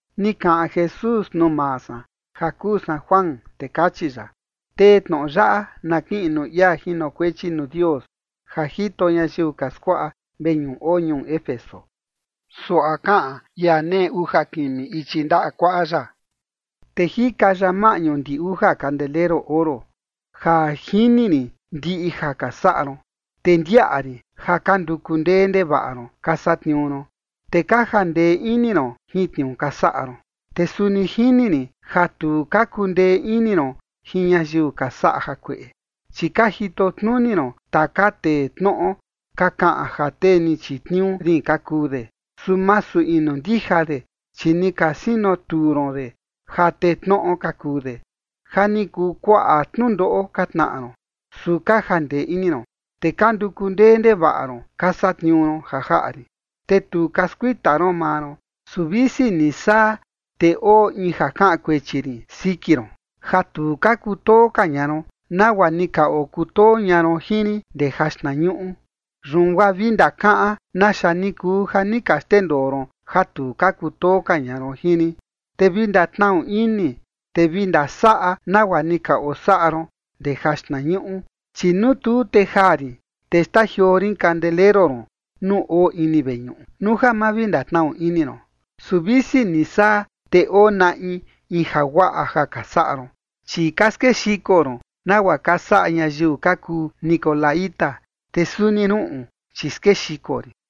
Ni kaꞌan Jesús nuu maa san ja kuu san Juan, te kachi ya: ―Tee tnoꞌo yaꞌa na kiꞌin nuu ia jinokuechi nuu Dios ja jito ñayiu ka skuaꞌa veñuꞌu oo ñuu Éfeso: Suaꞌa kaꞌan ia nee uja kimi ichi ndaꞌa kuaꞌa ya, te jika ya maꞌñu ndi uja kandeleru oro: “Ja jini rin ndiꞌi ja ka saꞌa ron, te ndiaꞌa rin ja ka nduku ndee ndevaꞌa ron ka satniuu ron, te ka jandee ini ron jin tniuu ka saꞌa ron. Te suni jini rin ja tu ka kundee ini ron jin ñayiu ka saꞌa jakueꞌe, chi ka jito tnuni ron taka tee tnoꞌo ka kaꞌan ja tee ni chitniuu rin ka kuu de, su masu inu ndija de, chi ni ka sinotuu ron de ja tee tnoꞌo ka kuu de. Ja ni kuu kuaꞌa tnundoꞌo ka tnaꞌa ron, su ka jandee ini ron, te ka nduku ndee ndevaꞌa ron ka satniuu ron ja jaꞌa rin, te tu ka skuita ron maa ron. Su visi ni saa, te oo in ja kaꞌan kuechi rin siki ron: ja tu ka kutoo ka ña ron nagua ni ka okutoo ña ron jin rin ndee jaxtnañuꞌu. Yun guaa vi ndakaꞌan naxa ni kuu ja ni ka xndendoo ron ja tu ka kutoo ka ña ron jin rin, te vi ndatnaꞌu ini, te vi ndasaꞌa nagua ni ka osaꞌa ron ndee jaxtnañuꞌu. Chi nuu tu, te jaa rin, te xtajioo rin kandeleru ron nuu oo ini veñuꞌu, nuu ja ma vi ndatnaꞌu ini ron. Su visi ni saa, te oo naꞌi in jaguaꞌa ja ka saꞌa ron, chi ka skexiko ron nagua ka saꞌa ñayiu ka kuu nicolaíta, te suni ruꞌun, chi skexiko rin.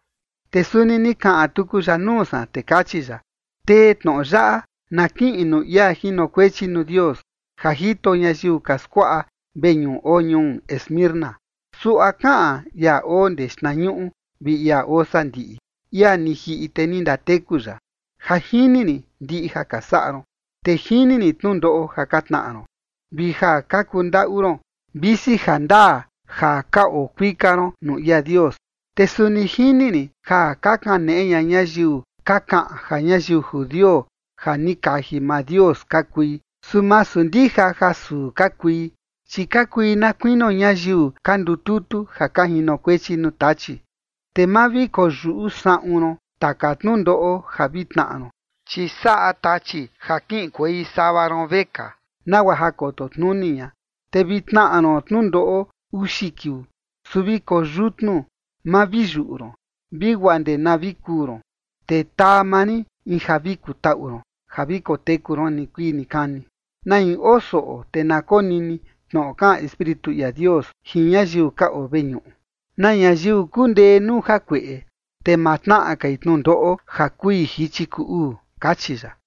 Te suni ni kaꞌan tuku ya nuu san, te kachi ya: ―Tee tnoꞌo yaꞌa na kiꞌin nuu ia jinokuechi nuu Dios ja jito ñayiu ka skuaꞌa veñuꞌu oo ñuu Esmirna: Suaꞌa kaꞌan ia oo ndee xtnañuꞌu vi ia oo sandiꞌi, ia ni jiꞌi, te ni ndateku ya: “Ja jini rin ndiꞌi ja ka saꞌa ron, te jini rin tnundoꞌo ja ka tnaꞌa ron, vi ja ka kundaꞌu ron, visi jandaa ja ka oo kuika ron nuu ia Dios. Te suni jini rin ja ka kaneꞌe ña ñayiu ka kaꞌan ja ñayiu judio ja ni kaji maa Dios ka kui, su masu ndija ja suu ka kui, chi ka kui na kuinio ñayiu ka ndututu ja ka jinokuechi nuu Tachi. Te ma vi koyuꞌu saꞌun ron taka tnundoꞌo ja vi tnaꞌa ron, chi saꞌa Tachi ja kiꞌinkuei sava ron vekaa, nagua ja koto tnuni ña, te vi tnaꞌa ron tnundoꞌo uxi kiuu. Su vi koyutnu, ma vi yuꞌu ron, vi guaa ndee na vi kuu ron, te taa maa rin in ja vi kutaꞌu ron ja vi koteku ron nikuii nikani. Na in oo soꞌo, te na konini tnoꞌo kaꞌan Espíritu ia Dios jin ñayiu ka oo veñuꞌu. Na ñayiu kundee nuu jakueꞌe, te ma tnaꞌa kai tnundoꞌo ja kui jichi kuu uu”, kachi ya.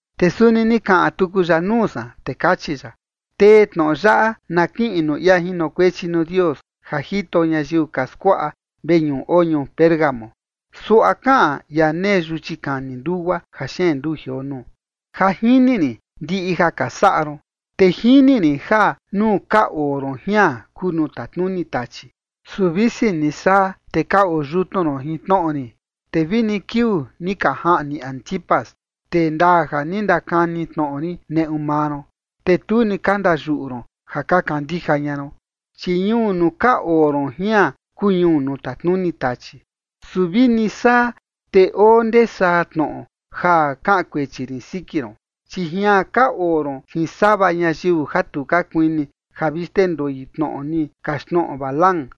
Te suni ni kaꞌan tuku ya nuu san, te kachi ya: ―Tee tnoꞌo yaꞌa na kiꞌin nuu ia jinokuechi nuu Dios ja jito ñayiu ka skuaꞌa veñuꞌu oo ñuu Pérgamo: Suaꞌa kaꞌan ia nee yuchi kani ndugua ja xeen nduu jioo nuu. “Ja jini rin ndiꞌi ja ka saꞌa ron, te jini rin ja nuu ka oo ron jian kuu nuu tatnuni Tachi. Su visi ni saa, te ka oo yutnu ron jin tnoꞌo rin, te vini kiuu ni ka jaꞌni Antipas, tee ndaa ja ni ndakani tnoꞌo rin neꞌu maa ron, te tu ni ka ndayuꞌu ron ja ka kandija ña ron. Chi ñuu nuu ka oo ron jian kuu ñuu nuu tatnuni Tachi. ’Su vini saa, te oo ndee saa tnoꞌo ja kaꞌan kuechi rin siki ron, chi jian ka oo ron jin sava ñayiu ja tu ka kuini ja vi xndendoi tnoꞌo ni kaxtnoꞌo Balaam,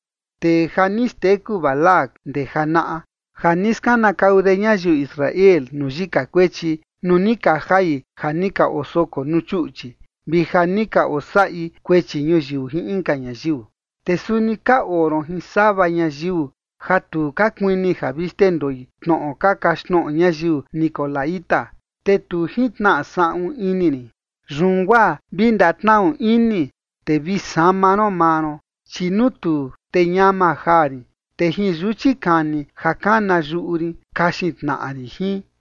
tee ja ni xteku Balac ndee janaꞌa, ja ni skanakau de ñayiu Israel nuu yika kuechi nuu ni ka jai ja ni ka osokoi nuu chuꞌchi vi ja ni ka osaꞌi kuechi ñuyiu jin inka ñayiu. Te suni ka oo ron jin sava ñayiu ja tu ka kuini ja vi xndendoi tnoꞌo ka kaxtnoꞌo ñayiu nicolaíta, te tu jintnaꞌa saꞌun ini rin. Yun guaa vi ndatnaꞌu ini, te vi sama ron maa ron, chi nuu tuu, te ñama jaa rin, te jin yuchi kani ja kana yuꞌu rin kaxin tnaꞌa rin jin.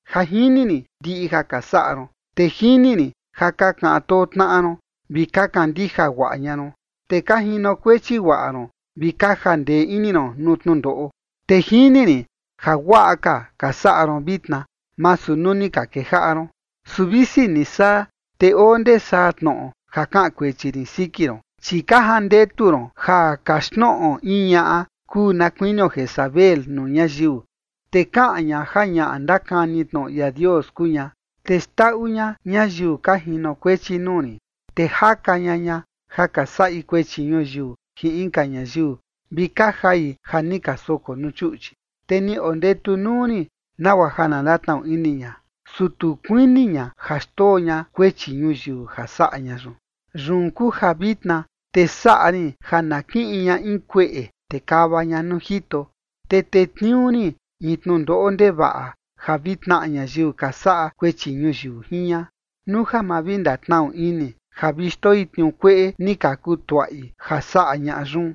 “Ja jini rin ndiꞌi ja ka saꞌa ron, te jini rin ja ka kaꞌan too tnaꞌa ron, vi ka kandija guaꞌa ña ron, te ka jinokuechi guaꞌa ron vi ka jandee ini ron nuu tnundoꞌo. Te jini rin ja guaꞌa ka ka saꞌa ron vitna, masu nuu ni ka kejaꞌa ron. ’Su visi ni saa, te oo ndee saa tnoꞌo ja kaꞌan kuechi rin siki ron, chi ka jandetu ron ja kaxtnoꞌo in ñaꞌa kuu na kuinio Jezabel nuu ñayiu, te kaꞌan ña ja ñaꞌa ndakani tnoꞌo ia Dios kuu ña, te xndaꞌu ña ñayiu ka jinokuechi nuu ni, te jaka ña ña ja ka saꞌi kuechi ñuyiu jin inka ñayiu vi ka jai ja ni ka soko nuu chuꞌchi. Te ni ondetu nuu rin nagua ja na ndatnaꞌu ini ña, su tu kuini ña ja xndoo ña kuechi ñuyiu ja saꞌa ña yun. ’Yun kuu ja vitna te saꞌa rin ja na kiꞌin ña in kueꞌe, te kava ña nuu jito, te tetniuu rin in tnundoꞌo ndevaꞌa ja vi tnaꞌa ñayiu ka saꞌa kuechi ñuyiu jin ña, nuu ja ma vi ndatnaꞌu ini ja vi xndoi tniuu kueꞌe ni ka kutuaꞌi ja saꞌa ñaꞌa yun.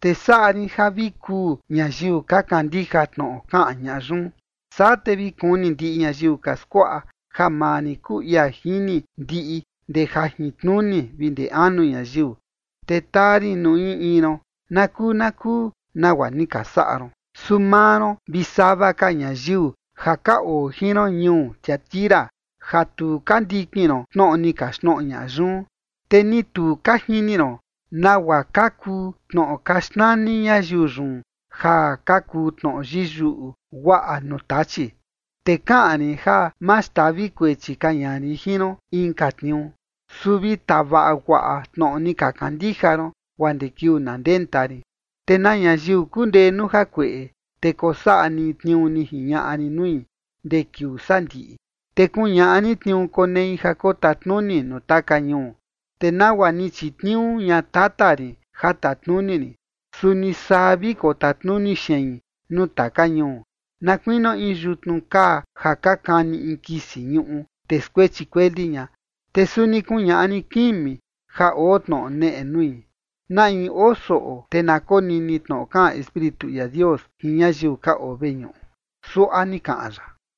Te saꞌa rin ja vi kuu ñayiu ka kandija tnoꞌo kaꞌan ñaꞌa yun. Saa te vi kuni ndiꞌi ñayiu ka skuaꞌa ja maa rin kuu ia jini ndiꞌi ndee jajintnuni vi ndee anu ñayiu. Te taa rin nuu in in ron nakuu nakuu nagua ni ka saꞌa ron. Su maa ron vi sava ka ñayiu ja ka oo jin ron ñuu Tiatira ja tu ka ndikin ron tnoꞌo ni kaxtnoꞌo ñaꞌa yun, te ni tu ka jini ron nagua ka kuu tnoꞌo ka xnani ñayiu yun ja ka kuu tnoꞌo yiyuꞌu guaꞌa nuu Tachi, te kaꞌan rin ja ma xtavi kuechi ka ña rin jin ron inka tniuu. Su vi tavaꞌa guaꞌa tnoꞌo ni ka kandija ron, guaa ndee kiuu na ndenta rin. Te na ñayiu kundee nuu jakueꞌe, te kosaꞌa ni tniuu ni jiñaꞌa rin nui ndee kiuu sandiꞌi, te kuñaꞌa rin tniuu konei ja kotatnuni nuu taka ñuu. Te nagua ni chitniuu ña Tata rin ja tatnuni rin, suni saa vi kotatnuni xein nuu taka ñuu, na kuinio in yutnu kaa ja ka kani in kisi ñuꞌu, te skuechi kueli ña. Te suni kuñaꞌa rin kimi ja oo tnoꞌo neꞌe nui. Na in oo soꞌo, te na konini tnoꞌo kaꞌan Espíritu ia Dios jin ñayiu ka oo veñuꞌu.” Suaꞌa ni kaꞌan ya.